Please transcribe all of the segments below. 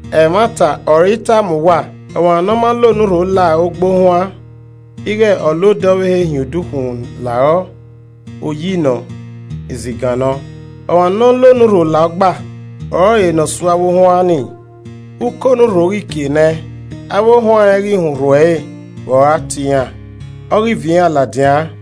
“Ẹmwata ọre I tama uwa, ọmwa nọ ma la onurho la ogba ohuan, ighẹ ọ la odẹ ọvbehe hin odukhunmwu la rọ, oyi nọ, izigan nọ. Ọmwa nọ la onurho la ogba ọrọre ne ọ su avbe ohuan nii. Ukọ onurho ghi kie nẹ, avbe ohuan rẹn ghi họn urhu ẹre vbe ọ gha tie iran, ọ ghi viọ iran ladian.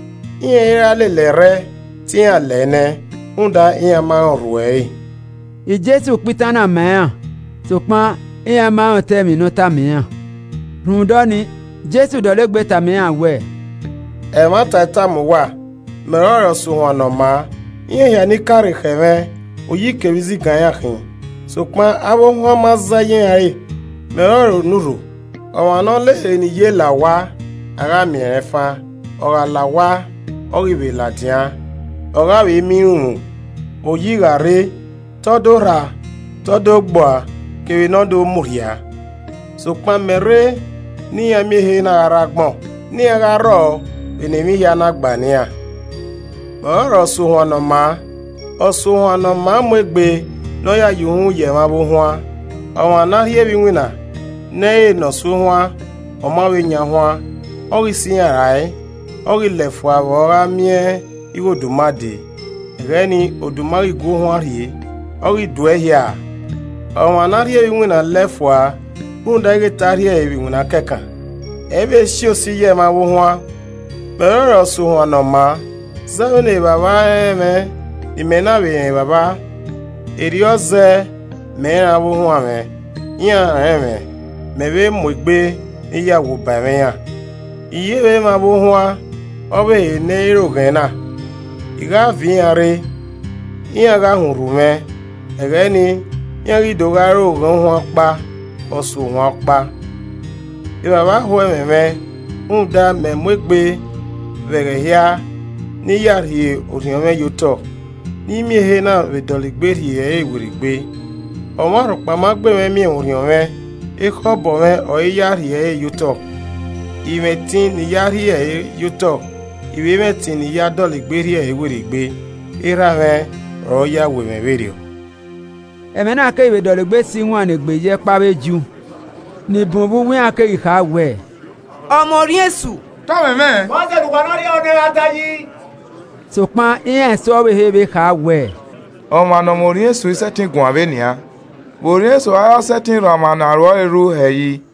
Iran i ra lele ẹrrẹ, te iran lẹ nẹẹn, rhunmwuda iran ma rẹn urhu ẹre.” Jesu kpa itan na ma iran, sokpan iran ma rẹn otọ emwi ne ọta ma iran. Rhunmwuda ọnii Jesu dọlegbe tama iran wẹẹ, “Ẹmwata I tama uwa, mẹ ọrọre ọsuohuan ne ọ maa. Iran hia ni ka rre khẹ mwẹ oyi kevbe izigan iran khin, sokpan avbe ohuan ma zẹ ye iran re. Mẹ ọrọre onurho. Ọmwa ne ọ la ehe ne i ye la owa, a gha miẹn rẹn fan. Ọ gha la owa, ọ ghi vbe ladian, ọ gha vbe miẹn irunmwu. Oyi gha rre, te ọ do rha, te ọ do gbe ua kevbe ne ọ do murhia. Sokpan mẹ rrọ ne iran miẹn ehe na gha rre agbọn, ne iran gha rrọọ vbe ne emwi hia na gba ne iran. “Mẹ ọrọre ọsuohuan ne ọ maa, ọsuohuan ne ọ maa mu egbe ne ọ ya ye uhunmwu ye ẹmwẹ avbe ohuan. Ọmwa ne a rhie vbe iwinna, ne ẹ i re ne ọ su ohuan, ọ ma vbe yan ohuan, ọ ghi sẹ iran rae, ọ ghi lẹ fua vbe ọ gha miẹn ighẹ oduma dee, ẹghẹ nii oduma ghi gua ohuan rhie, ọ ghi duẹ ehia a. Ọmwa ne a rhie vbe iwinna lẹ fua rhunmwuda ighẹ te a rhie ẹre vbe iwinna kẹkan, ẹ i vbe si osi ye ẹmwẹ avbe ohuan. Mẹ ọrọre ọsuohuan ne ọ maa. Zẹ vbene Evbavba rẹn mwẹ, ne imẹ na vbe rẹn Evbavba, erriọ zẹẹ mẹ rẹn avbe ohuan mwẹ, iran vbe rẹn mwẹ, mẹ vbe mu egbe ne I ya wu ba ẹmwẹ iran. I ye vbe mwẹ avbe ohuan ọvbehe ne ẹ i re oghẹn na. I gha vbe viọ iran rre, iran gha họn urhu mwẹ, ẹghẹ nii, iran ghi do gha re oghẹn ohuan ọkpa, ọsuohuan ọkpa. “Evbavba ho ẹmwẹ mwẹ, rhunmwuda, mẹ mu egbe vbe ẹghẹ hia ne I ya rhie orhiọn mwẹ ye otọ, ne I miẹn ehe na vbe dọlegbe rhie ẹre werriegbe. Ọmwa rhọkpa ma gbe mwẹ miẹn mwẹ orhiọn mwẹ, ekhọe obọ mwẹ ọre I ya rhie ẹre ye otọ. I mwẹ ẹtin ne I ya rhie ẹre ye otọ, I vbe mwẹ ẹtin ne I ya dọlegbe rhie ẹre werriegbe. Erha mwẹ ọre ọ ya wẹ mwẹ vberriọ.” Ẹmwẹ na keghi vbe dọlegbe si iwannegbe ye ẹkpo avbe Ju. Ni bun vbe uwu iran kegha kha wẹẹ, “Ọ mwẹ orhiọn esu, te ọ mwẹmwẹ, vbọzẹ ne uwa na rhie ehọ nẹ ẹn gha ta yi?” Sokpan iran eso ọvbehe vbe kha wẹẹ, “Ọmwa ne ọ mwẹ orhiọn esu i sẹtin guan vbe nian. Vbe orhiọn esu a ra sẹtin rhan ọmwa ne aro ẹre rhu hẹ yi?”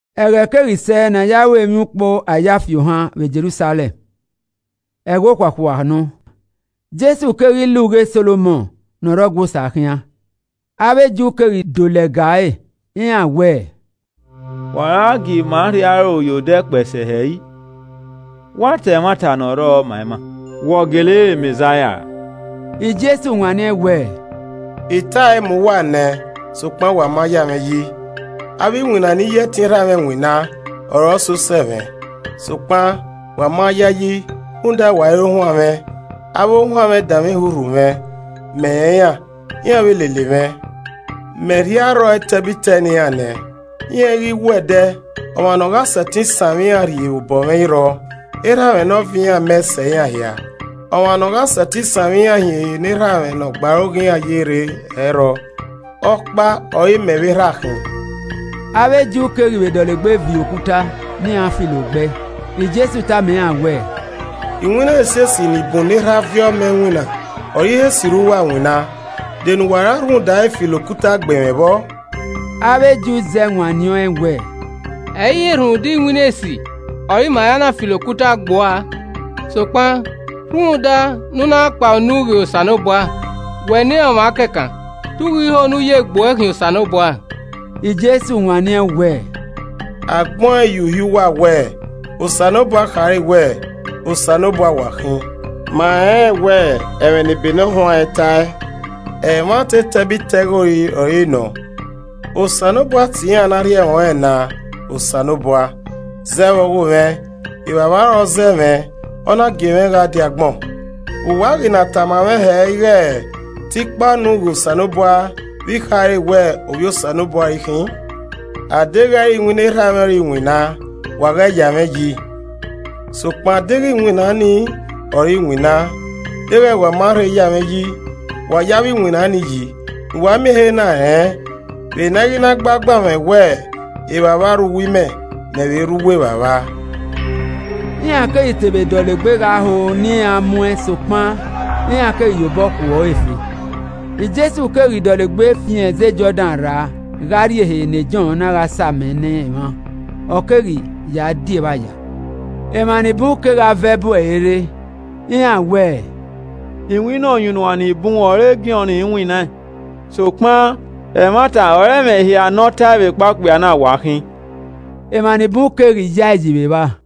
Ẹghẹ keghi sẹ ne a ya ru emwiukpo Ayafiohan vbe Jerusalẹm, ẹghẹ okhuakhua nọ. Jesu keghi la ugha Solomọn ne ọ rre ọgua Osa khian. Avbe Ju keghi do lẹga ẹre, iran wẹẹ, “Vbe u a gha gie ima rhie aro ye odẹ kpẹe sẹ hẹ? Wa ta ẹmwata ne ọ rrọọ ma ima. Wẹ ọ gele re Mẹzaia ra?” Jesu wanniẹn wẹẹ, “I tae ma uwa nẹ sokpan wa ma ya mwẹ yi. Avbe iwinna ne I ya ẹtin Erha mwẹ winna ọre ọ sẹ osẹe mwẹ. Sokpan wa ma yayi rhunmwuda wa i re ohuan mwẹ. Avbe ohuan mwẹ danmwehọ urhu mwẹ. Mẹ rẹn iran, iran vbe lele mwẹ. Mẹ rhie arrọọ etẹbitẹ ne iran nẹ, iran i ghi wu ẹdẹ, ọmwa ne ọ gha sẹtin sanmwẹ iran rhie vbe obọ mwẹ i rrọọ. Erha mwẹ ne ọ viọ iran mẹ sẹ iran hia, ọmwa ne ọ gha sẹtin sanmwẹ iran hin ehe ne Erha mwẹ ne ọ gbe aro ghe iran ye rre, ẹ i rrọọ. Ọkpa ọ re Mẹ vbe Erha khin.” Avbe Ju keghi vbe dọlegbe viọ okuta ne iran filo gbe ẹe. Jesu tama iran wẹẹ, “Iwinna esiesi ni bun ne Erha viọ mẹ winna ọre I he sirra uwa winna, de ne uwa ra rhunmwuda ẹre filo okuta gbe mwẹ vbọ?” Avbe Ju zẹ wanniẹn ọẹn wẹẹ, “Ẹ i re rhunmwuda iwinna esi ọre ima ra na filo okuta gbe ua a, sokpan rhunmwuda ne u na kpa unu ghe Osanobua, wẹ ne ọmwa kẹkan, te u ghi ho ne u ya egbe uẹ khian Osanobua!” Jesu wanniẹn wẹẹ, “A gbẹn ọẹn ye Uhi uwa wẹẹ, Osanobua khare wẹẹ, ‘Osanobua wa khin?’ Ma rẹnrẹn wẹ ẹmwẹ ne ebe ne ọ huanrẹn tae, ẹmwata ẹtẹbitẹghori ọre nọ. Osanobua tie iran ne a rhie ẹmwẹ ọnrẹn na, Osanobua. Zẹ vbe ọghomwẹ, Evbavba ọre ọ zẹ mwẹ, ọ na gie mwẹ gha die agbọn. Vbe uwa a ghi na tama mwẹ hẹ ighe te I kpa unu ghe Osanobua vbe I khare wẹẹ Ovbi Osanobua ọre I khin? Adeghẹ ẹ i re iwinna Erha mwẹ ọre I winna, wa ghẹ ya mwẹ yi. Sokpan deghẹ iwinna nii ọre I winna, deghẹ wa ma rhe ya mwẹ yi, wa ye avbe iwinna ni yi, ne uwa miẹn ehe na rẹn vbe ne a i ghi na gbe agbanmwẹ wẹ Evbavba rre uwu imẹ, mẹ vbe rre uwu Evbavba.” Iran keghi te vbe dọlegbe gha ho ne iran mu ẹn sokpan iran keghi ye obọ khuọre fe. Jesu keghi dọlegbe fian ẹzẹ Jọdan rra gha rrie ehe ne Jọn na gha sa amẹ ne emwa, ọ keghi ya di evba ya. Emwa ni bun kegha vẹ bu ẹre rre. Iran wẹẹ, “Iwinna ọyunnuan ni bun ọre Jọn winnaẹn sokpan ẹmwata ọre ẹmwẹ hia ne ọ tae vbekpa okpia na wa khin.” Emwa ni bun keghi ya ẹ yi vbe evba.